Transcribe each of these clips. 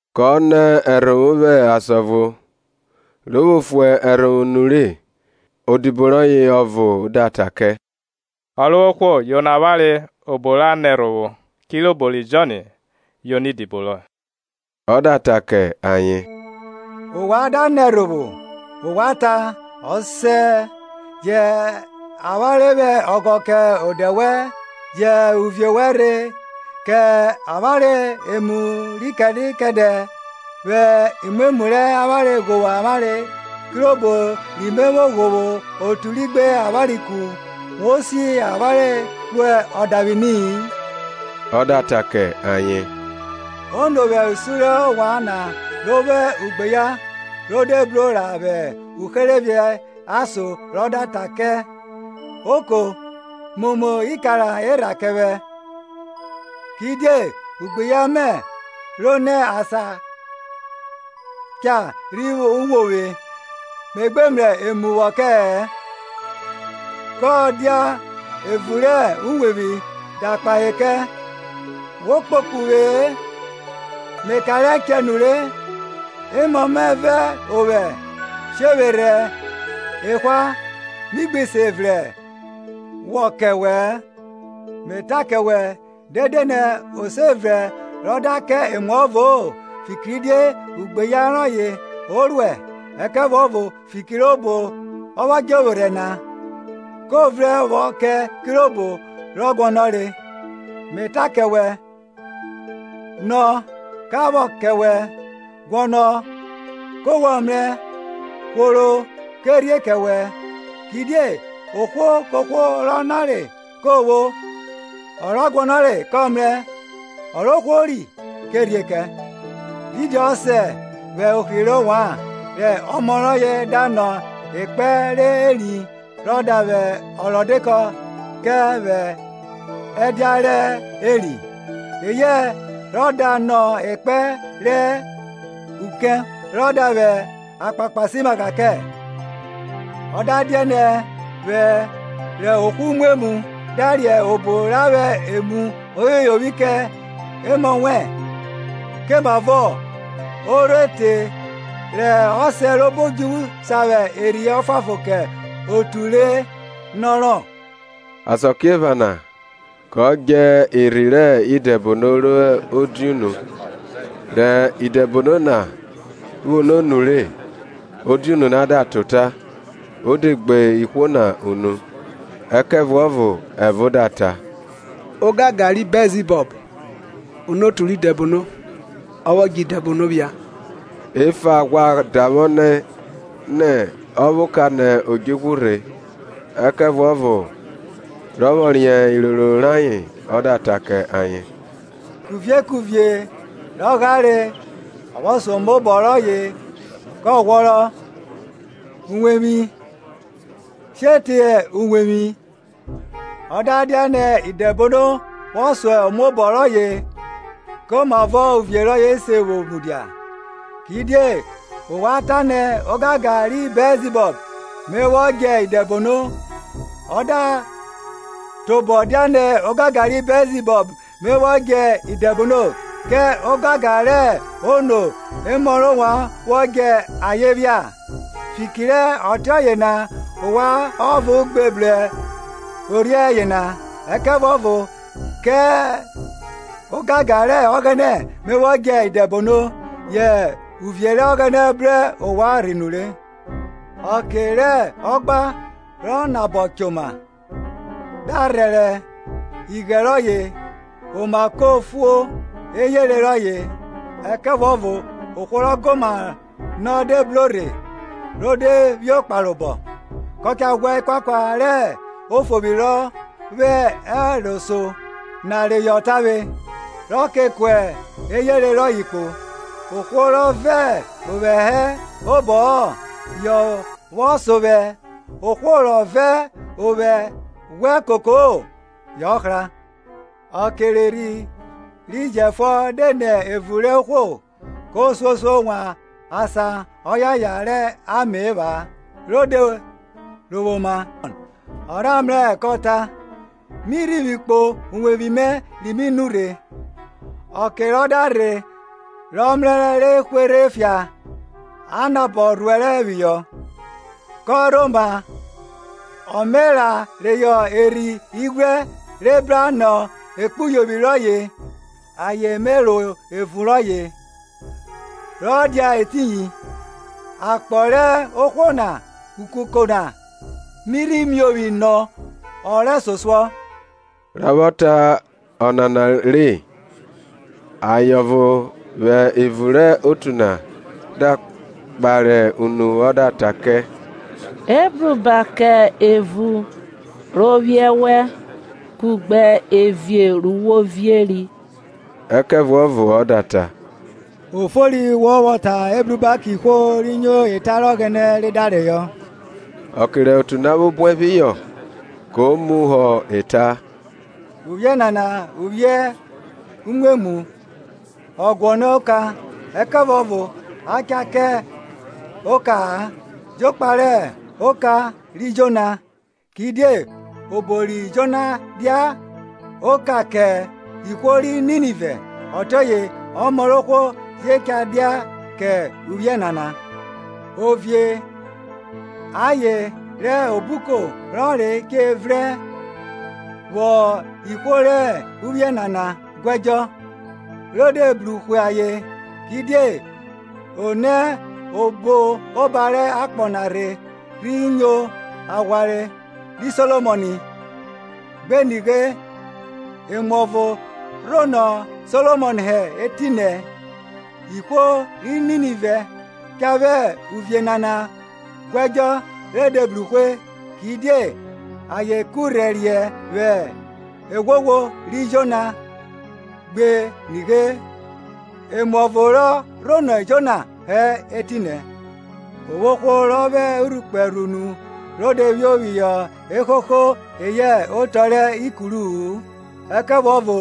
Kọ nẹ ẹrhovwo vwẹ asan ọvo, ro vwo fue ẹrhovwo nure, odibo rọye ọvo da ta kẹ, Ọrovwohwo yono avwanre obo ra nẹ ẹrhovwo, kirobo ri Jọn yono idibo rọye. Ọ da ta kẹ ayen, Ovwan da nẹ ẹrhovwo, ovwan ta, Ọsẹ, jẹ avwanre vwẹ ọghọ kẹ odẹ wẹn, jẹ uvie wẹn rhe. Kẹ avwanre emu ri kẹdẹ kẹdẹ; vwẹ imwemwu rẹ avwanre ghovwo avwanre, kirobo ri me vwo ghovwo otu ri gbe avwanre ku; Wo si avwanre ro odavwini-i. Ọ da ta kẹ ayen, Ono vwẹ usun rẹ ovwan na ro vwo ugbeyan ro de bro ra vwẹ uherevie ason rọ da ta kẹ, Oko, momo ikara erha kẹ vwẹ; Kidie ugbeyan mẹ ro nẹ asan cha rhi wo vwe, Me gbe mrẹ emu vwọ kẹ-ẹ; kọ dia evun rẹ uwevwi da kpahe kẹ, Wo kpokpo uvwe-e; Me kanre ẹchẹ nure, emọ mẹ vẹ ovwẹ shevwerhẹ ehwa; mi gbi se vrẹn vwọ kẹ wẹ-ẹ? Me ta kẹ wẹ, dede nẹ o se vrẹn rọ da kẹ emuọvo-o fikiridie ugbeyan rọye o ruẹ, ẹkẹvuọvo fiki robo rọ vwọ djẹ ovwerhẹ na, ko vrẹn vwọ kẹ kirobo rọ guọnọre. Me ta kẹ wẹ, Nọ, ka vwọ kẹ wẹ; guọnọ, ko wọ mrẹ; hworo, ke rhie kẹ wẹn. Kidie ohwo kohwo rọ nọre ko vwo, ọ rọ guọnọre kọ mrẹ, ọ ro hwori ke rhie kẹ. Didi ọsẹ vwẹ ohri rẹ ovwan, rẹ ọmọ rọye da nọ ekpẹn rẹ eri, rọ da vwẹ ọrọdekọ kẹ vwẹ ẹdia rẹ eri, eyẹ rọ da nọ ekpẹn rẹ ukẹn, rọ da vwẹ akpakpasimagha kẹ? Ọ da dianẹ, wẹ rẹ ohwo umwemwu, da riẹn obo ra vwẹ emu oyoyovwi kẹ emọ wẹn, komavọ ọ rho te rẹ ọsẹ robo odjuvwu sa vwẹ Erhi Ọfuanfon kẹ otu re nọrọ? Asakiephana kọ djẹ erhi rẹ idẹbono ro diunu; rẹ idẹbono na vwo no nure, odiunu na da ta ota, o de gbe ihwo na unu. Ẹkẹvuọvo ẹvo da ta, Ogangan rẹ Bẹlzibọb, onotu rẹ idẹbono, ọ vwọ djẹ idẹbono phia, efa ghwa davwọ nẹ, nẹ ọ vwẹ oka nẹ odjnvwa rhe. Ẹkẹvuọvo rọ vwọ riẹn iroro rayen, ọ da ta kẹ ayen, Kuvie kuvie rọ ghare vwọ so omaobọ rọye kọ ghwọrọ, uwevwi she teye uwevwi. Ọ da dianẹ Idẹbono vwọ so omaobọ rọye, komavọ uvie rọye se vwo mudia? Kidie ovwan ta nẹ ogangan ri Bẹlzibọb Me vwọ djẹ idẹbono. Ọ da tobọ dianẹ ogangan ri Bẹlzibọb me vwọ djẹ idẹbono, kẹ ogangan rẹ ono emọ rẹ ovwan vwọ djẹ ayen phia? Fiki rẹ ọtiọye na ovwan ọvo gbe brorhiẹ yena. Ẹkẹvuọvo kẹ ogangan rẹ Ọghẹnẹ me vwọ djẹ idẹbono, yẹ uvie rẹ Ọghẹnẹ bru ovwan rhe nure Ọke rẹ ọgba, rọ nabọ choma, da rhẹrẹ ighẹn rọye, oma ko fu eyere rọye; ẹkẹvuọvo ohwo rọ goma nọ de bro rhe ro de phio kparobọ, kọ ka ghwa ekuakua rẹ ofovwi rọ vwẹ ẹro so na reyọ tavwe, rọ ke kua eyere rọye kpo. Ohwo rọ vẹ ovwẹ hẹ obọ-ọ yọ vwọ so vwẹ, ohwo rọ vẹ ovwẹ ghwẹ koko-o yọ hra. Ọke rẹ erhi ro jẹfuọn de nẹ evun rẹ ohwo, ko suosuo wan asan ọyaya rẹ ame epha-a ro de rovwo oma; ọ rha mrẹ-ẹ kọ ta, Mi rhivwi kpo uwevwi mẹ ri mi nurhe. Ọke rọ da rhe rọ mrẹrẹ re hwerhe fia a nabọ rhuẹrẹ phihọ. Kọ rhoma ọ me ra reyọ erhi ighwrẹ re bra nọ ekpuyovwi rọye, ayen me ro evun rọye ra dia etiyin; akpọ rẹ ohwo na ukuko na mi rhi miovwi nọ ọ rẹsosuọ. Rọ vwọ ta ọnana re, aye ọvo vwẹ evun rẹ otu na da kpare unu ọ da ta kẹ, Ebruba kẹ evun ro vwiẹ wẹ, kugbe evie ru wo vieri! Ẹkẹvuọvo ọ da ta, Ofori wọ vwọ ta, Ebruba kẹ ihwo ri nyo eta rẹ Ọghẹnẹ re da yọnrọn. Ọke re otu na vwo buẹ phihọ, ko muhọ ẹta, Uvwiẹ nana uvwiẹ umwemwu; ọ guọnọ oka, ẹkẹvuọvo a cha kẹ oka-a jokpa rẹ oka ri Jona. Kidie obo ri Jona dia oka kẹ ihwo ri Ninive, ọtiọye ọmọ rẹ ohwo je cha dia kẹ uvwiẹ nana. Ovie aye rẹ Obuko ọnre che vrẹn vwọ ihwo rẹ uvwiẹ nana guẹdjọ ro de bru hwe ayen; kidie o nẹ obo oba rẹ akpọ na rhe rhi nyo aghwanre ri Solomọn, gbe nighe, emuọvo rọ rhonọ Solomọn hẹ etinẹ. Ihwo ri Ninive cha vwẹ uvwiẹ nana guẹdjọ re de bru hwe; kidie ayen kurhẹriẹ vwẹ eghwoghwo ri Jona, gbe nighe, emuọvo rọ rhonọ Jona hẹ etinẹ. O vwo ohwo rọ vwẹ urhukpẹ rhu nu ro de phio phihọ eghogho eyẹ otọ rẹ ikuru-u, ẹkẹvuọvo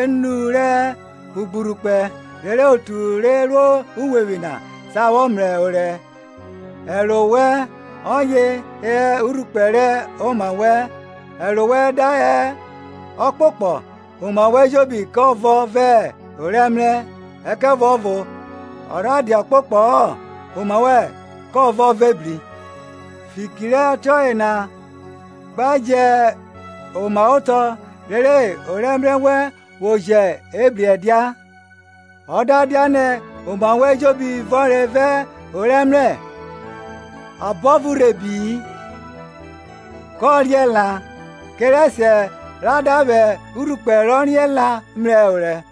enu rẹ ogburhukpẹ, rere otu re ro uwevwi na sa vwọ mrẹ orẹ. Ẹro wẹn ọye hẹ urhukpẹ rẹ oma wẹn; ẹro wẹn da hẹ ọkpokpọ, oma wẹn ejobi kọ vọn vẹ orẹmrẹ; ẹkẹvuọvo ọ rha dia ọkpokpọ-ọ, oma wẹn kọ vọ vẹ ebri. Fiki rẹ ọtiọye na gba jẹ omaotọ rere orẹmrẹ wẹn vwo jẹ ebri ẹdia. Ọ da dianẹ oma wẹ ejobi vọnre vẹ orẹmrẹ, abọvo rhe bi-i, kọ riẹn la, kẹrẹsiẹ ra da vwẹ urhukpẹ rọ riẹn la mrẹ orẹ.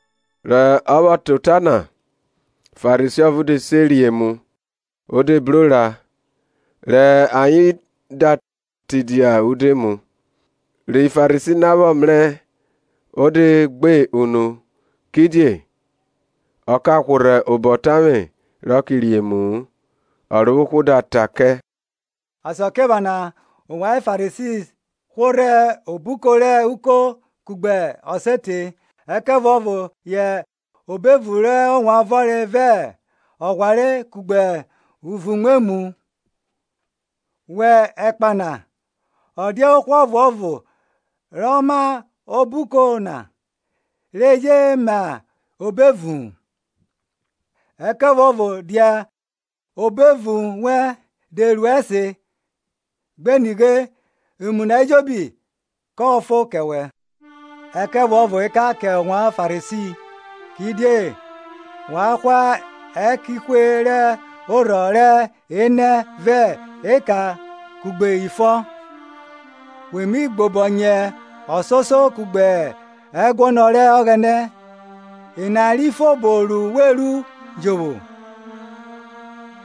Rọ vwọ ta ota na, Farisi ọvo de se re emu; o de bro ra ayen da tidia udoemu. Ri Farisi na vwọ mrẹ o de gbe unu kidie ọ ka hworhẹ obọ tavwe rọ ke re emu-u. Ọrovwohwo da ta kẹ, Asakiephana ovwan Farisi hworhẹ obuko rẹ uko kugbe ọsete, ẹkẹvuọvo yẹ obo evun rẹ ovwan vọnre vẹ ọghware kugbe uvun-umwemwu. Wẹ ẹkpa na, ọ dia ohwo ọvuọvo rọ ma obuko na re je ma obo evu-un? Ẹkẹvuọvo dia obo evun wẹn de ru ẹse; gbe nighe, emu na ejobi kọ fon kẹ wẹ. Ẹkẹvuọvo ekan kẹ ovwan Farisi! Kidie wa hwa ẹkẹnhwe rẹ orhọ rẹ enẹ vẹ eka kugbe ifọ, we mi gbobọnyẹ ọsoso kugbe ẹguọnọ rẹ Ọghẹnẹ; ena ri fo obo ru we ru jovwo,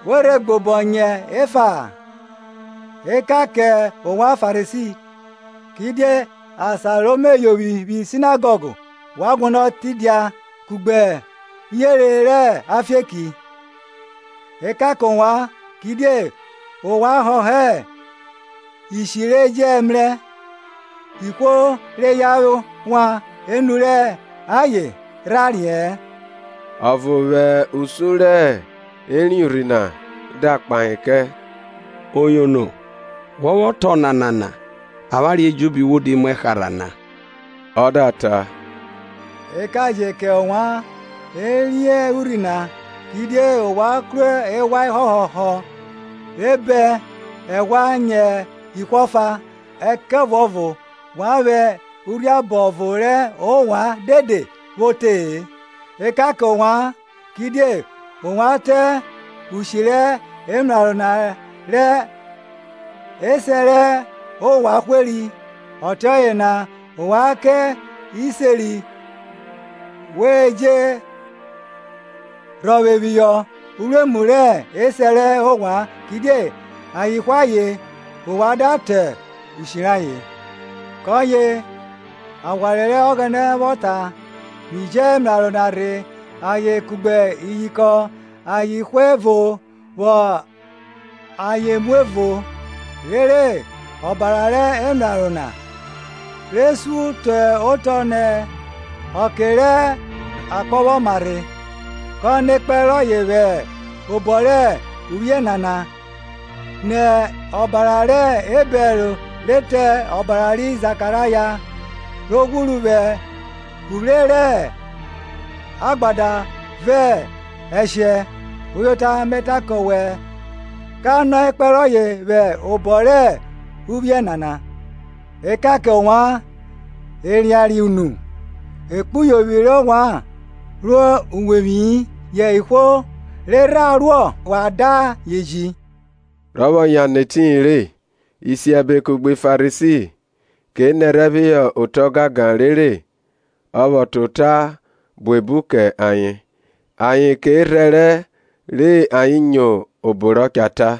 we rhe gbobọnyẹ efa-a. Ẹkan kẹ ovwan Farisi! kidie asan ro me yovwi vwi Sinagọg wa guọnọ tidia kugbe uyere rẹ afieki. Ekan kẹ ovwan! kidie ovwan họhọ ishi re jẹ mrẹ, ihwo re yan wan enu rẹ ayen rha riẹ-ẹn. Ọvo vwẹ usun re ẹriẹn urhi na da kpahe kẹ. Oyono, wọ vwọ ta ọnana na avwanre ejobi wo di muẹ harha na. Ọ da ta, Ekan je kẹ ovwan ẹriẹn urhi nai! kidie ovwan kru eghwa ehọhọhọ re bẹn ẹghwa nyẹ ihwo efa, ẹkẹvuọvo wa vwẹ urhiabọ ọvo rẹ ovwan dede vwo te-e. Ekan kẹ ovwan! kidie ovwan tọn ushi rẹ emraro na rẹ esẹ rẹ ovwan hweri. Ọtiọye na ovwan kẹ iseri wa je rhọvwe phihọ uruemu rẹ esẹ rẹ ovwan; kidie ayen hwe ayen, ovwan da tọn ushi rayen. Kọye Aghwanre rẹ Ọghẹnẹ vwọ ta, Mi ji emraro na rhe ayen kugbe iyinkọn ayen hwe ẹvo vwọ ayen mu ẹvo, rere ọbara rẹ emraro na, re sun te otọ nẹ ọke rẹ akpọ vwọ mama rhe, ka nọ ekpẹn rọye vwẹ obọ rẹ uvwiẹ nana, nẹ ọbara rẹ Ebẹl re te ọbara ri Zakaraya, ro ghwuru vwẹ uvwre rẹ agbada vẹ ẹshẹ. Uyota me ta kẹ wẹ, ka nọ ekpẹn rọye vwẹ obọ rẹ uvwiẹ nana. Ekan kẹ ovwan erianriẹn na; ekpuyovwi rẹ ovwan ro uwevwi-i, yẹ ihwo re rha ruọ wa da ayen ji. Rọ vwọ yan nẹ etiyin re, isiẹbe kugbe Farisi ke nẹrhẹ phihọ ota gangan rere ọ ta ota buebu kẹ ayen, ayen ke rhẹrẹ, re ayen nyo obo rọ cha ta.